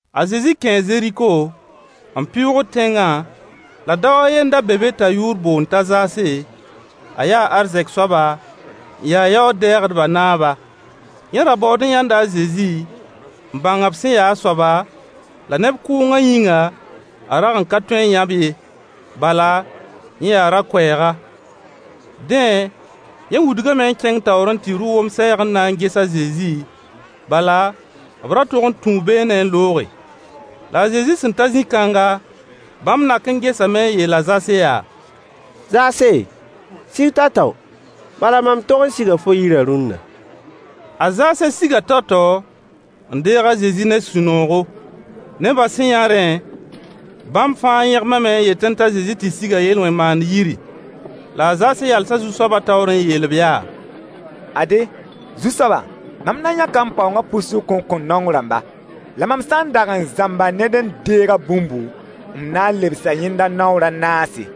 A Zezi kẽe Zeriko, n pɩʋʋgd tẽngã, la dao a ye n da be be t'a yʋʋr boond t'a Zaase, a yaa arzɛk soaba n ya yaood-dɛɛgdbã naaba. Yẽ ra baood n yãnda a Zezi n bãng b sẽn ya a soaba, la neb kʋʋngã yĩnga, a rag n ka tõe n yã-b ye, bala yẽ yaa rao-kʋɛɛga. Dẽ, yẽ wudgame n kẽng taoor n tɩ rʋ wom-sɛɛg n na n ges a Zezi, bala b ra tog n tũu beene n looge. La a Zezi sẽn ta zĩ-kãnga, bãmb nak n gesame n yeel a Zaase yaa: Zaase, sig tao-tao, bala mam tog n siga fo yirã rũnna. A Zaase siga tao-tao n deeg a Zezi ne sũ-noogo. Nebã sẽn yã rẽ, bãmb fãa yẽgmame n yetẽ t'a Zezi tɩ siga yel-wẽn-maand yiri. La a Zaase yalsa Zu-soabã taoor n yeel-b yaa: Ade, Zu-soaba, mam na n yãka m paoongã pʋɩ-sʋk n kõ naong rãmba. La mam sã n dag n zãmba ned n deeg a bũmbu, m na n lebsa yẽnda naoor a naase.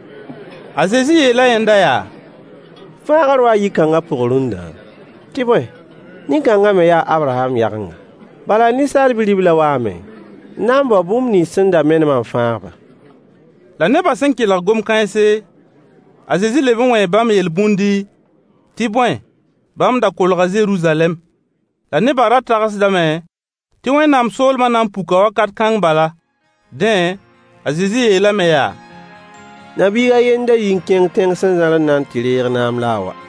A Zezi yeela yẽnda yaa: Fãagr waa yi-kãnga pʋg rũndã, tɩ bõe, nin-kãnga me ya a Abraham yagenga. Bala Ninsaal Bi-ribla waame n na n bao bũmb nins sẽn da menema n fãag-ba. La neba sẽn kelg gom-kãense, a Zezi leb n wẽe bãmb yel-bũndi, tɩ bõe, bãmb da kolga Zeruzalɛm. La nebã ra tagsdame tɩ Wẽnnaam soolmã na n puka wakat kãng bala. Dẽ, a Zezi yeelame yaa: Na-biig a yembr n da yi n kẽng tẽng sẽn zãr n na n tɩ reeg naam la n wa.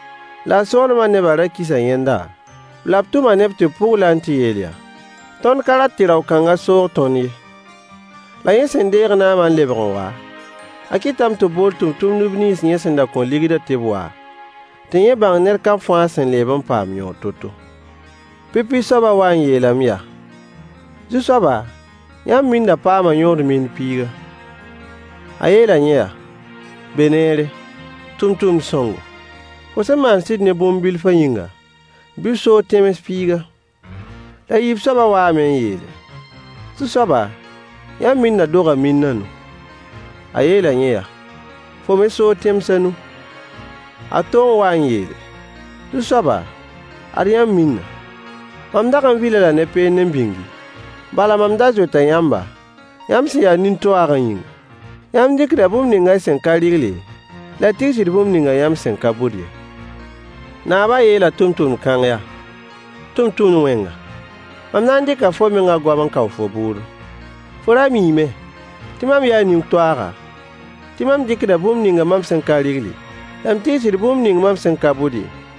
La a soolmã neba ra kisa yẽnda, la b tʋma neb tɩ b pʋgl-a n tɩ yeel yaa: “Tõnd ka rat tɩ rao-kãnga soog tõnd ye.” La yẽ sẽn deeg naama n lebg n wa, a kɩtame tɩ b bool tʋmtʋmdb nins yẽ sẽn da kõ ligdã tɩ b wa, tɩ yẽ bãng ned kam fãa sẽn leeb n paam yõod to-to. Pipi soabã waa n yeelame yaa: “Zu-soaba yãmb minna paama yõod min piiga.” A yeela yẽ yaa: “Be neere, tʋmtʋmd-sõngo, fo sẽn maan sɩd ne bũmb bilfã yĩnga, bɩ f soog tẽms piiga.” La yiib soabã waame n yeele: “Zu-soaba, yãmb minna doga min a nu.” A yeela yẽ yaa: “Fo me soog tẽms a nu.” A to n waa n yeele: “Zu-soaba, ad yãmb minna! Mam dag n vil-a-la ne peend n bĩngi, bala, mam da zoeta yãmba, yãmb sẽn ya nin-toaagã yĩnga. Yãmb dɩkda bũmb ninga y sẽn ka rɩgle, la y tigsd bũmb ninga yãmb sẽn ka bʋd ye.” Naabã yeela tʋmtʋmd kãng yaa: “Tʋmtʋmd-wẽnga, mam na n dɩka fo menga goam n kao fo bʋʋdo. Fo ra miime tɩ mam yaa nin-toaaga, tɩ mam dɩkda bũmb ning mam sẽn ka rɩgle, la m tigsd bũmb ning mam sẽn ka bʋd ye,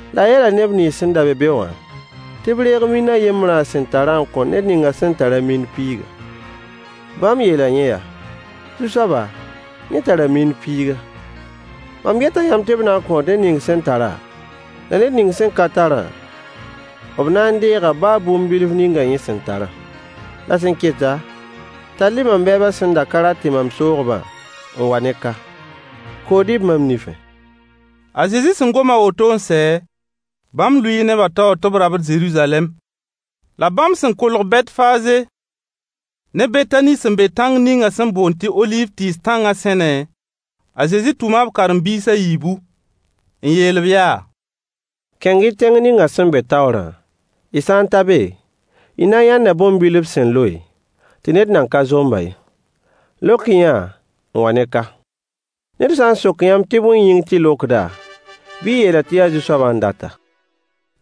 La a yeela neb nins sẽn da be be wã tɩ b reeg min a yembrã a sẽn tarã n kõ ned ning sẽn tar-a min piigã. Bãmb yeela yẽ yaa: “Zu-soaba, yẽ tara min piiga.” Mam yeta yãmb tɩ b na kõo ned ning sẽn tara, la ned ning sẽn ka tarã, b na n deega baa bũmb bilf ninga yẽ sẽn tarã. La sẽn keta, tall-y mam bɛɛbã sẽn da ka rat tɩ mam soog-bã n wa ne ka. Kood-y-b mam nifẽ. A Zezi sẽn gom a woto n sɛ, bãmb lʋɩɩ nebã taoor tɩ b rabd Zeruzalɛm. La bãmb sẽn kolg Bɛtfaaze ne Betani sẽn be tãng ninga sẽn boond tɩ oliiv tɩɩs tãngã sẽne, a Zezi tʋma b karen-biis a yiibu. N yeel-b yaa: Kẽng-y tẽng ninga sẽn be taoorã, y sã n ta be, y na n yãnda bõn-bil b sẽn loe, tɩ ned nan ka zomb-a. Lok-y-yã-a, n wa ne ka. Ned sã n sok yãmb tɩ bõe yĩng tɩ y lokd-a, bɩ y yeel-a tɩ yaa Zu-soabã n dat-a.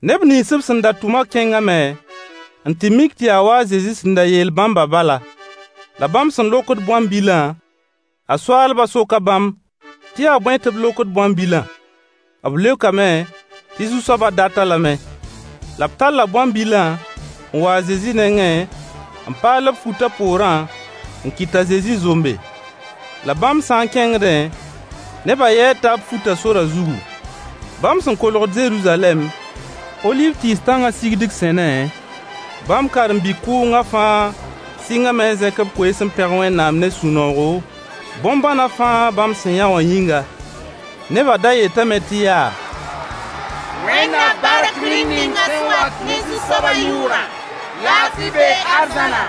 Neb nins b sẽn da tʋma kẽngame n tɩ mik tɩ yaa wa a Zezi sẽn da yeel bãmbã bala. La bãmb sẽn lokd bõn-bilã, a soaalbã soka bãmb tɩ yaa bõe tɩ b lokd bõn-bilã. B leokame tɩ Zu-soabã dat-a lame. La b talla bõn-bilã n wa a Zezi nengẽ, n paal b fut a poorã n kɩt t'a Zezi zombe. La bãmb sã n kẽngdẽ, nebã yɛɛta b futã sorã zugu. Bãmb sẽn kolgd Zeruzalɛm, oliiv tɩɩs tãngã sigdg sẽne, bãmb karen-bi-kʋʋngã fãa sɩngame n zẽk b koees n pẽg Wẽnnaam ne sũ-noogo, bõn-bãna fãa bãmb sẽn yã wã yĩnga. Nebã da yetame tɩ yaa: Wẽnd na bark rĩm ninga sẽn wat ne Zu-soabã yʋʋrã! Laafɩ bee arzãna,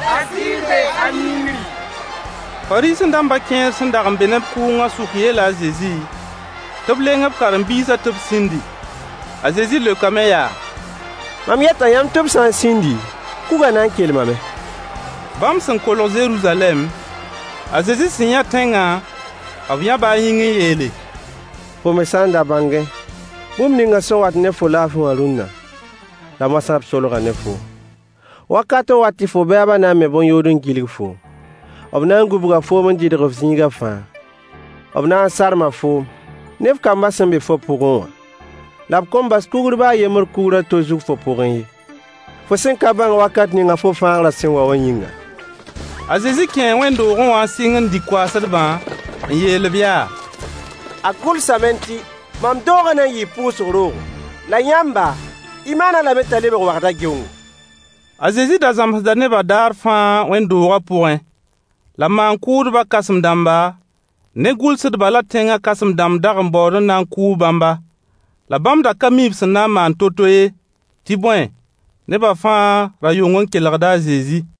la ziir bee hal yĩngri. Fariisẽ-dãmba kẽer sẽn dag n be neb kʋʋngã sʋk yeela a Zezi tɩ b leng b karen-biisã tɩ b sĩndi. A Zezi leokame yaa: Mam yeta yãmb tɩ b sã n sĩndi, kugã na n kelmame! Bãmb sẽn kolg Zeruzalɛm, a Zezi sẽn yã tẽngã, b yãba a yĩng n yeele: Fo me sã n da bãngẽ bũmb ninga sẽn wat ne fo laafɩ wã rũnna! La moasã b solga ne foom. Wakat n wat tɩ fo bɛɛba na n me bõn-yood n gilg foom. B na n gũbga foom n dɩdg-f zĩiga fãa. B na n sarma foom ne f kambã sẽn be fo pʋgẽ wã, la b kõn bas kugr baa yembr kugr a to zug fo pʋgẽ ye, fo sẽn ka bãng wakat ninga fo fãagrã sẽn wa wã yĩnga. A Zezi kẽe wẽnd-doogẽ wã n sɩng n dig koaasdbã, n yeel-b yaa: A gʋlsame tɩ: “Mam doogã na n yɩɩ pʋʋsg roogo, la yãmba, y maan-a lame t'a lebg wagda geongo.” A Zezi da zãmsda nebã daar fãa wẽnd-doogã pʋgẽ. La maan-kʋʋdbã kãsem-dãmba ne gʋlsdbã la tẽngã kãsem-dãmb dag n baood n na n kʋʋ bãmba. La bãmb da ka mi b sẽn na n maan to-to ye, tɩ bõe nebã fãa ra yong n kelgda a Zezi.